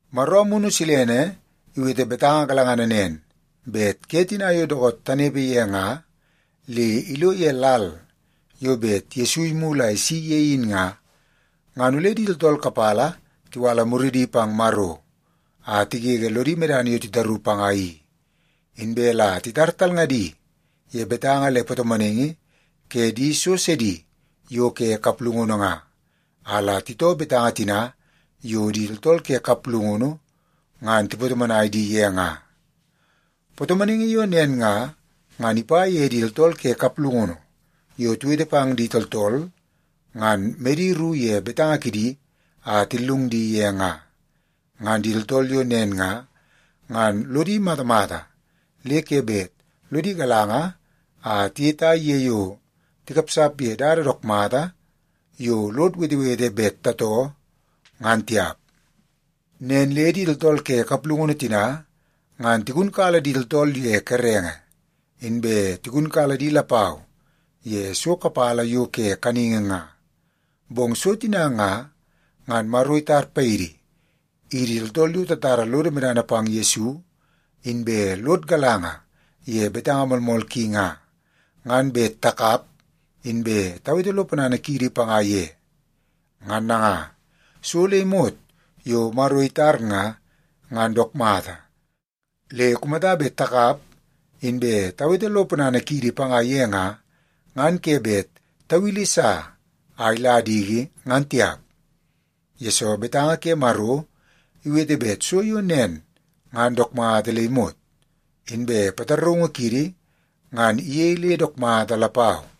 Maro Amunu Silene iwete betanga galangana nen bet ke tina yo dookoot tanepe ye nga le ilo ye lal yo bet Yesu imulu a isi ye in nga, ngan ole di tooltool kapala tiwala muridi pang Maro a tigege lodi medana yo titaru panga i. Inbe la titar talngadi ye betanga le patomonaingi ke di so sidi yo ke kaplungunu nga, a la titoo betanga tina yo di tooltool ke kaplungunu ngan tipatomonai di ye nga. Patomonaingi yo nen nga, ngan ipa ye di tooltool ke kaplungunu yo tiwete pang di tooltool, ngan medi ru ye betanga kidi a tillung di ye nga. Ngan di tooltool yo nen nga, ngan lodi matamata le ke bet lodi galanga a tiyetai ye yo tikapsap ye dada dook mata yo lod wetewete bet tatoo, ngan tiap. Nen le di tooltool ke kaplungunu tina, ngan tigunkala di tooltool ye kerenge, inbe tigunkala di lapau ye so kapala yo ke kaningi nga. Bong so tina nga, ngan Maro itar paidi, idi tooltool yo tatara lodo medana pang Yesu inbe lod galanga ye betanga moolmool ki nga, ngan bet takap inbe tawete lo ponana kiidi panga ye. Ngan nanga, so le imot yo Maro itar nga, ngan dook mata. Le kumata bet takap inbe tawete lo ponana kiidi panga ye nga, ngan ke bet tawili sa a ila diki, ngan tiap. Yesoo, betanga ke Maro iwete bet so yo nen ngan dook mata le imot. Inbe pataraungu kiidi ngan iyei le dook mata lapau.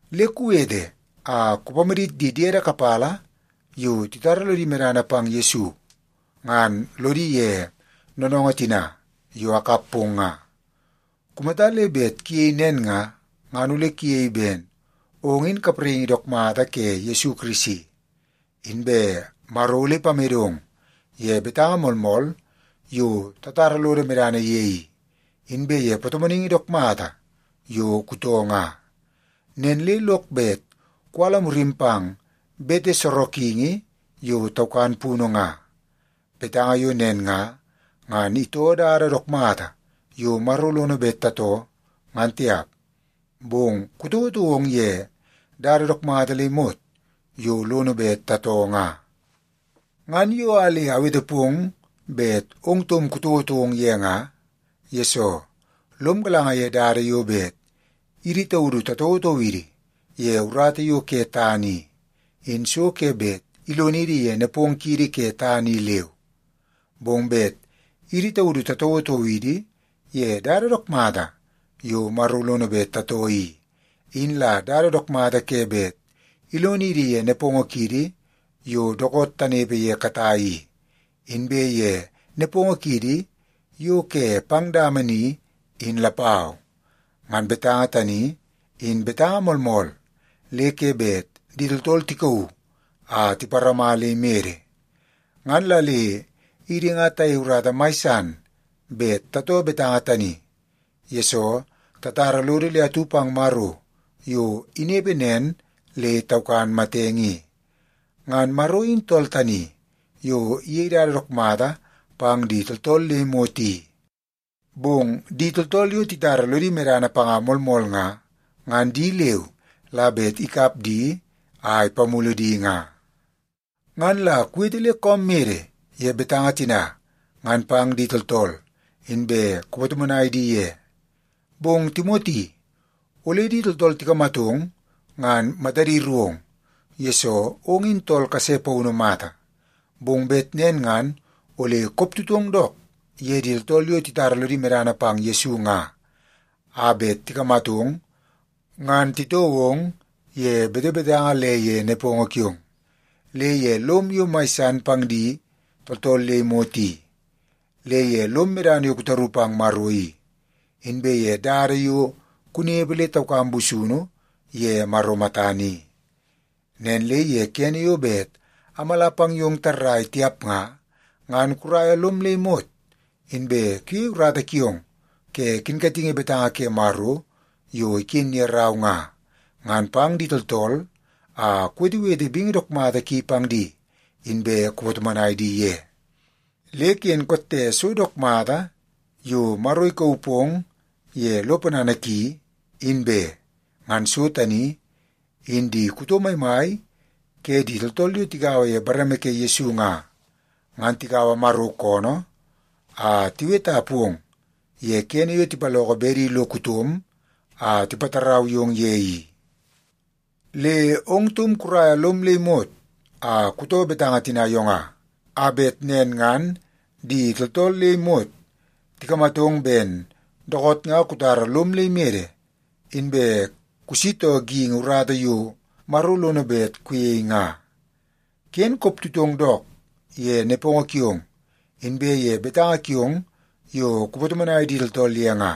Le kuwete a kupamadit di diede kapala yo titara lodi medana pang Yesu ngan lodi ye noonoongoo tina yo akap pong nga. Kumata le bet kuyei nen nga, ngan ole kuyei ben ong in kapraingi dook mata ke Yesu Kirisi. Inbe Maro ole ipamedong ye betanga moolmool yo tatara lodo medana ye i, inbe ye patomonaingi dook mata yo kutoo nga. Nen le lok bet kuwala murim pang bete sorokingi yo taukan punu nga. Betanga yo nen nga, ngan itoo dada dook mata yo Maro lono bet tatoo, ngan tiap. Bong kutouotou ong ye dada dook mata le imot yo lono bet tatoo nga. Ngan yo a le awete pong bet ong taum kutouotou ong ye nga, yesoo lom galanga ye dada yo bet idi taudu tatouotou idi ye urata yo ke tana i, in so ke bet ilonidi ye nepongo kiidi ke tana i leu. Bong bet idi taudu tatouotou idi ye dada dook mata yo Maro lono bet tatoo i, in la dada dook mata ke bet ilonidi ye nepongo kiidi yo dookoot tanepe ye katai i, inbe ye nepongo kiidi yo ke pang dama ni, in lapau. Ngan betanga tani, in betanga moolmool le ke bet di tooltool tikauu a tiparama le imede. Ngan la le idi nga tayei urata mai san bet tatoo betanga tani, yesoo tatara lodo le atu pang Maro yo inepe nen le taukan matenge i. Ngan Maro in tool tani yo iyei dada dook mata pang di tooltool le imot i. Bong di tooltool yo titara lodi medana panga moolmool nga, ngan di leu la bet ikap di a ipamulu di nga. Ngan la kuwete le koom mede ye betanga tina ngan pang di tooltool, inbe kupatomonai di ye. Bong Timoti, ole di tooltool tikamatong ngan matadi ru ong, yesoo ong in tool kase paunu mata. Bong bet nen ngan ole koptutong dook ye di tooltool yo titara lodi medana pang Yesu nga a bet tikamatong, ngan titoo ong ye betebetanga le ye nepongo kiong, le ye lom yo mai san pang di tooltool le imot i, le ye lom medana yo kutaru pang Maro i, inbe ye dada yo kunepe le taukam busunu ye Maro matana i. Nen le ye kene yo bet amala pang yong tarrai tiap nga, ngan kuraia lom le imot inbe kuyei urata kiong ke kinkatingi betanga ke Maro yo iken ye rau nga, ngan pang di tooltool a kuwetewete bingi dook mata ki pang di, inbe kupatomonai di ye. Le ken kotte so dook mata yo Maro ikauu pong ye lo ponana ki, in be. Ngan so tani in di kuto maimai ke di tooltool yo tigaua ye bareme ke Yesu nga, ngan tikaua Maro koonoo a tiweta pong ye kene yo tipaloko bedi lo kutom a tipatarau yong ye i. Le ong taum kuraia lom le imot a kutoo betanga tina yo nga, a bet nen ngan di tooltool le imot tikamatong ben dookoot nga kutara lom le imede, inbe kusitoo geingi urata yo Maro lono bet kuyei nga. Ken koptutong dook ye nepongo kiong inbe ye betanga kiong yo kupatomonai di tooltool ye nga.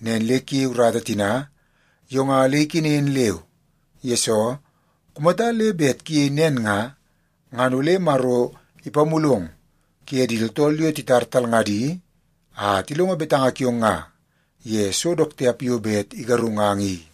Nen le kuyei urata tina yo nga le ikenen leu, yesoo kumata le bet kuyei nen nga, ngan ole Maro ipamulong kuye di tooltool yo titar talngadi a tilongo betanga kiong nga ye so dook tiap yo bet igarungang i.